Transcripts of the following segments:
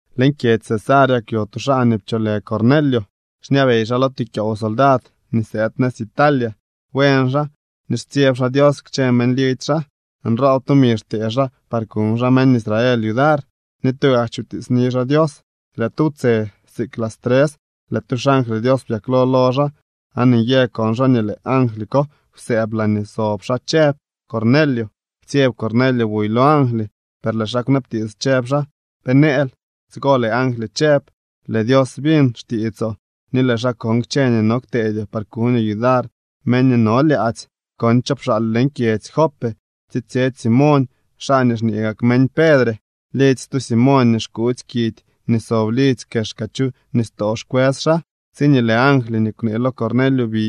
Leñ kyedzy Cesarea kwyo tu xaa nii pcholë Cornelio. Xñabey xaa lo tu kyoow soldad nii sëëd nëz Italia. Buen xaa ni xtsyeb xaa Dios kchë meñ lidzy xaa. Nroob tumi xtee xaa par kuñ xaa meñ Israel yudar, ni tugak chutiitsni xaa Dios. Lëë tu wtse, siik las tres, lëë tu xangly Dios byaklo lo xaa aan nyë kon xaa nii lëë angly ko kwsëëb laañee sob xaa chëb: —¡Cornelio! Ptsyeb Cornelio buy lo angly, per lëë xaa kwnabtiits, chëb xaa: —¿Pe nëël? Tsigo lëë angly chëb: —Lëë Dios biñ xtiitsoo ni lëë xaa kon kchë nii no kteedyoo par kuñoo yudar meñ nii no lyaadzy. Kon cho pxaal leñ kyedzy Jope tsitsyetsy Simoñ, xaa nii xñee gak meñ Pedre. Lidzy stu Simoñ nii xkuutsy kidy nii sob lidzy kexka chu nistoo xkwës xaa. Tsiñee lëë angly nii kwnee lo Cornelio bi,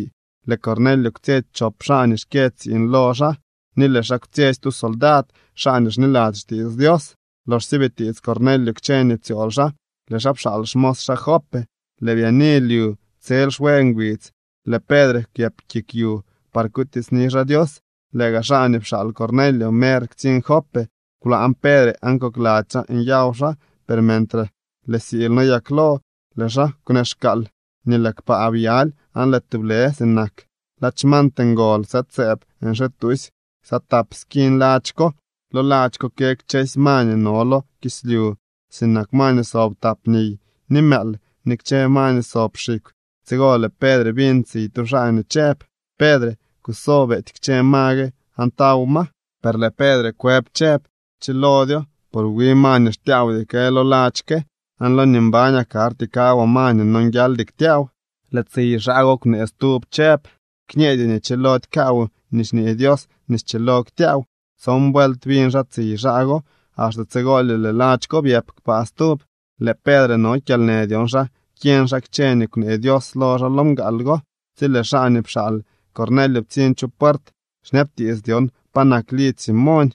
lëë Cornelio kwtsyetsy chop xaa nii xkyë tsiiñ lo xaa ni lëë xaa kwtsyetsy tu xsoldad xaa nii xniladzy xtiits Dios. Loxsye bitiits Cornelio kchë nii ptsyool xaa, lëë xaa pxaal xmos xaa Jope. Lëë byaani lyu, tsel xwe ngbidz lëë Pedre kwyëp kik yu par kutiitsni xaa Dios. Lëë gaa xaa nii pxaal Cornelio mer ktsiñ Jope. Kwlaañ Pedre aan kokladzy xaa nyaw xaa, per mentre lëë siily noyaklo, lëë xaa kwneexkaal nii lëë kpaa byaly, aan lëë tublë sinak ladx mant ngol sëëd sëëb nxituusy ksa tap skiñ ladx ko. Lo ladx ko kë kchëlo ma nii no lo kislyu, sinak ma nii sob tap niy, ni mëël, ni kchë ma nii sob xikw. Tsigo lëë Pedre biñ tsiy tu xaa nii chëb: —Pedre, kuso, beety kchë ma gue aan taw ma. Per lëë Pedre kwëb chëb: —Chilodyo, por wi ma nii xtyaawdy kë lo ladx ke, aan lo nii mbañaa karty kawaa ma nii nonguialdy ktyaaw. Lëë tsiy xaa go kwnee stub chëb: —Kñeedyoo nii chilody kaawoo nii xñee Dios nii schilo ktyaaw. Tson vuelt biñ xaa tsiy xaa go, axte tsigolye lëë ladx ko byëp kpaa stub. Lëë Pedre no kyalnë dyon xa kyeñ xaa kchë nii kwnee Dios lo xaa lo mgaal go, tsi lëë xaa nii pxaal Cornelio ptsiñ chu puert xñabtiits dyon pa nak lidzy Simoñ.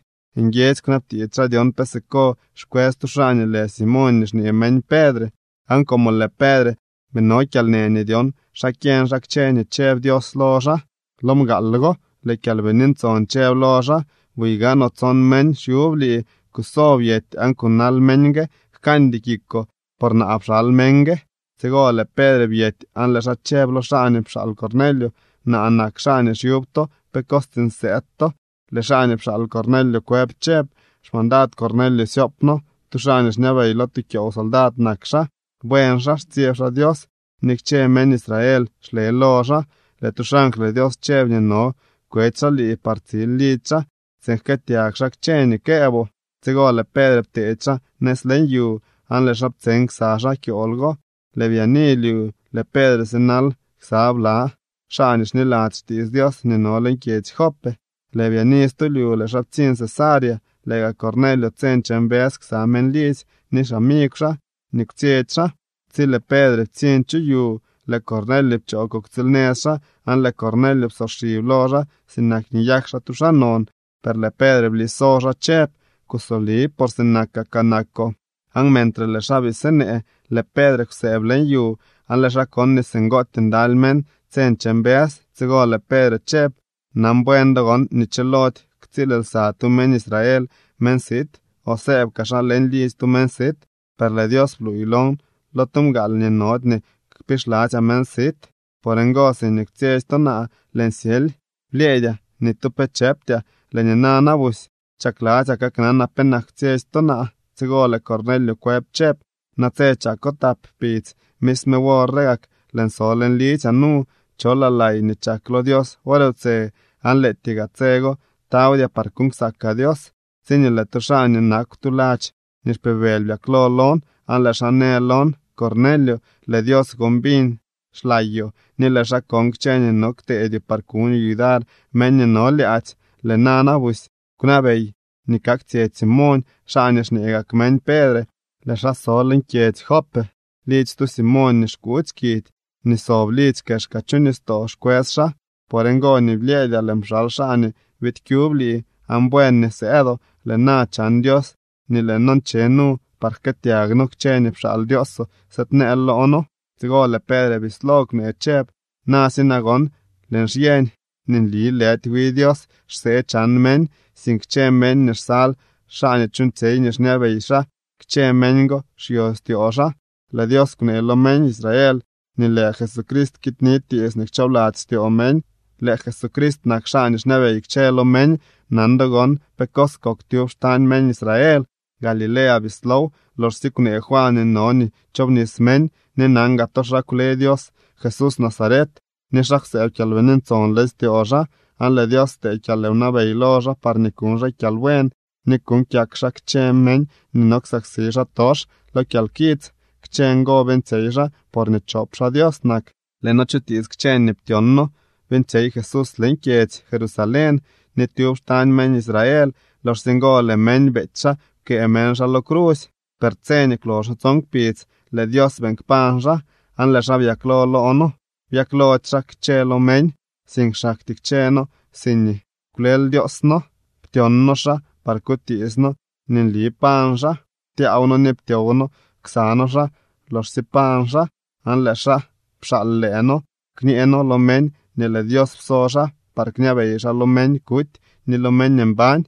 Nguiedzy kwnabtiits xaa dyon pe siko xkwës tu xaa nii lë Simoñ nii xñee meñ Pedre. Aan como lëë Pedre bii no kyalnë nii dyon xa kyeñ xaa kchë nii chëb Dios lo xaa lo mgaal go, lëë Kyalbini Ntson chëb lo xaa: —Buy gaanoo, tson meñ xyub lii. Kuso, byety aan kunal meñ gue. Jkañdy kikoo, por naa pxal meñ gue. Tsigo lëë Pedre byety aan lëë xaa chëb lo xaa nii pxaal Cornelio: —Naa nak xaa nii xyub to. ¿Pe cos tsiiñ sëëd to? Lëë xaa nii pxaal Cornelio kwëb chëb: —Xmandad Cornelio syoop noo. Tu xaa nii xñabey lo tu kyoow soldad nak xaa. Buen xaa, xtsyeb xaa Dios, ni kchë meñ Israel xle lo xaa. Lëë tu xangly Dios chëb nii no kwetsy xaa lii par tsil lidzy xaa tsiin jkëëtyag xaa kchë nii këëboo. Tsigo lëë Pedre pteedy xaa nëz leñ yu, aan lëë xaa ptseñ ksa xaa kyool go. Lëë byaani lyu, lëë Pedre sinal ksa bla xaa nii xniladzy xtiits Dios nii no leñ kyedzy Jope. Lëë byaani stu lyu lëë xaa ptsiñ Cesarea. Lëë gaa Cornelio tse nche mbës ksa meñ lidzy ni xamigw xaa nii kwtsyetsy xaa. Tsi lëë Pedre ptsiñ chu yu, lëë Cornelio pchoo kuktsiilnëz xaa aan lëë Cornelio psoxib lo xaa sinak nii nyak xaa tu xaa non. Per lëë Pedre bliso xaa chëb: —Kusoli, por sinakakaa nakoo. Aan mentre lëë xaa bii sinee, lëë Pedre kwsëëb leñ yu aan lëë xaa kon nii singootyee ndaly meñ tse nche mbës. Tsigo lëë Pedre chëb: —Nan buen do gon nii chilody ktsiil lsa tu meñ Israel meñ sit o sëëb kaa xaa leñ lidzy tu meñ sit. Per lëë Dios bluuy lon lo tu mgaal nii nody nii kpixladzyaa meñ sit. Por ngo, siñee kwtsyetsy to naa, lëën syely. Blyëëdyaa. Ni tu pe chëptyaa. Lëë nina na busy, chakladzyaa kaknanaa penak kwtsyetsy to naa. Tsigo lëë Cornelio kwëb chëb: —Natse chako tap kpidz, misme wor re gak lëën so leñ lidzyaa nu, cholaa lay nii chak lo Dios wor wtse aan lëëtyee gaa tse go tawdyaa par kuuñ ksakaa Dios, tsiñee lëë tu xaa nii nakw tu ladx nii xpibëly byaklo lon. Aan lëë xaa në lon: Cornelio, lëë Dios gon biñ xlayoo ni lëë xaa kon kchë nii no kteedyoo par kuñoo yudar meñ nii no lyaadzy. Lëë nana busy kwnabey nii kaktsyetsy Simoñ, xaa nii xñee gak meñ Pedre. Lëë xaa so leñ kyedzy Jope. Lidzy stu Simoñ nii xkuutsy kidy nii sob lidzy kexka chu nistoo xkwës xaa. Por ngo nii blyëëdyaa lëën pxal xaa nii biid kyub lii, aan buen nii sëëdoo. Lëë na chan Dios nii lëë noo nche nu par jkëëtyag noo kchë nii pxaal Dioosoo sëëdneel loo noo. Tsigo lëë Pedre bislo kwnee chëb: —Na si nagon, lëën xyeñ nii nli lëdy wi Dios xsee chan meñ, sink kchë meñ nii xsal xaa ni chuuñtsyey nii xñabey xaa, kchë meñ go xyo styoo xaa. Lëë Dios kwnee lo meñ Israel nii lëë Jesucrist kiidni tiits nii kchoobladzy styoo meñ. Lëë Jesucrist nak xaa nii xñabey kchë lo meñ. Nan do gon pe cos kok tyub xtañ meñ Israel. Galilea bislow, loxsye kwnee Juan nii no nii chobnis meñ. Ni nan gaa to xa kwle Dios Jesús Nazaret ni xa kwsëëb Kyalbini Ntson leñ styoo xaa. Aan lëë Dios ptee kyalwnabey lo xaa parñee kuñ xaa kyalbuen ni kuuñ kyak xaa kchë meñ nii no ksaksi xaatox lo kyalkits. Kchë ngo beeñtsyey xaa porñee chop xaa Dios nak. Lëë noo chutiits kchë nii ptyon noo beeñtsyey Jesús leñ kyedzy Jerusalén ni tyub xtañ meñ Israel. Loxsye ngo lëë meñ beety xaa, pkëë meñ xaa lo crusy. Per tse nii kwloxo tson kpidz lëë Dios beeñ kpañ xaa, aan lëë xaa byaklo loo noo. Byaklody xaa kchë lo meñ, sink xaktyee kchëë noo siñee kwlel Dioos noo, ptyon noo xaa par kutiits noo nii nli pañ xaa. Ptyaaw noo ni ptyow noo ksa noo xaa loxsye pañ xaa. Aan lëë xaa pxaal lëë noo kñee noo lo meñ nii lëë Dios pso xaa par kñabey xaa lo meñ kuty ni lo meñ mbañ.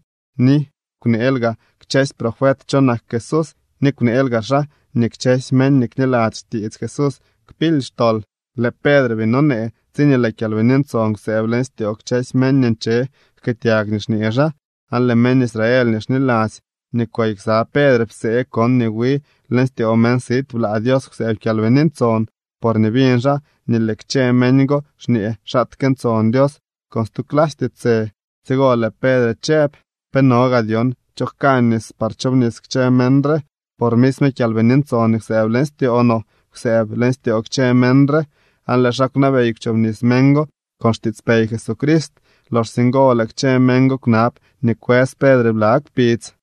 Ni kwneel gaa kchësy profet cho nak Jesús, ni kwneel gaa xaa nii kchësy meñ nii kniladzy xtiits Jesús kpily xtol. Lëë Pedre bii nonee, tsiñee lëë Kyalbini Ntson kwsëëb leñ styoo kchësy meñ nii nche jkëëtyag nii xñee xaa. Aan lëë meñ Israel nii xniladzy nii kwey ksa Pedre psee kon nii wi leñ styoo meñ sit blaa Dios kwsëëb Kyalbini Ntson, porñee biñ xaa nii lëë kchë meñ go xñee xaatke ntson Dios con stu clasy tiitsë. Tsigo lëë Pedre chëb: —¿Pe no gaa dyon cho jka nis par chobnis kchë meñ re, por misme Kyalbini Ntson nii kwsëëb leñ styoo no kwsëëb leñ styoo kchë meñ re? Aan lëë xaa kwnabey kwchobnis meñ go con xtiitspey Jesucrist. Loxsye ngo lëë kchë meñ go kwnab nii kwës Pedre bla kpidz.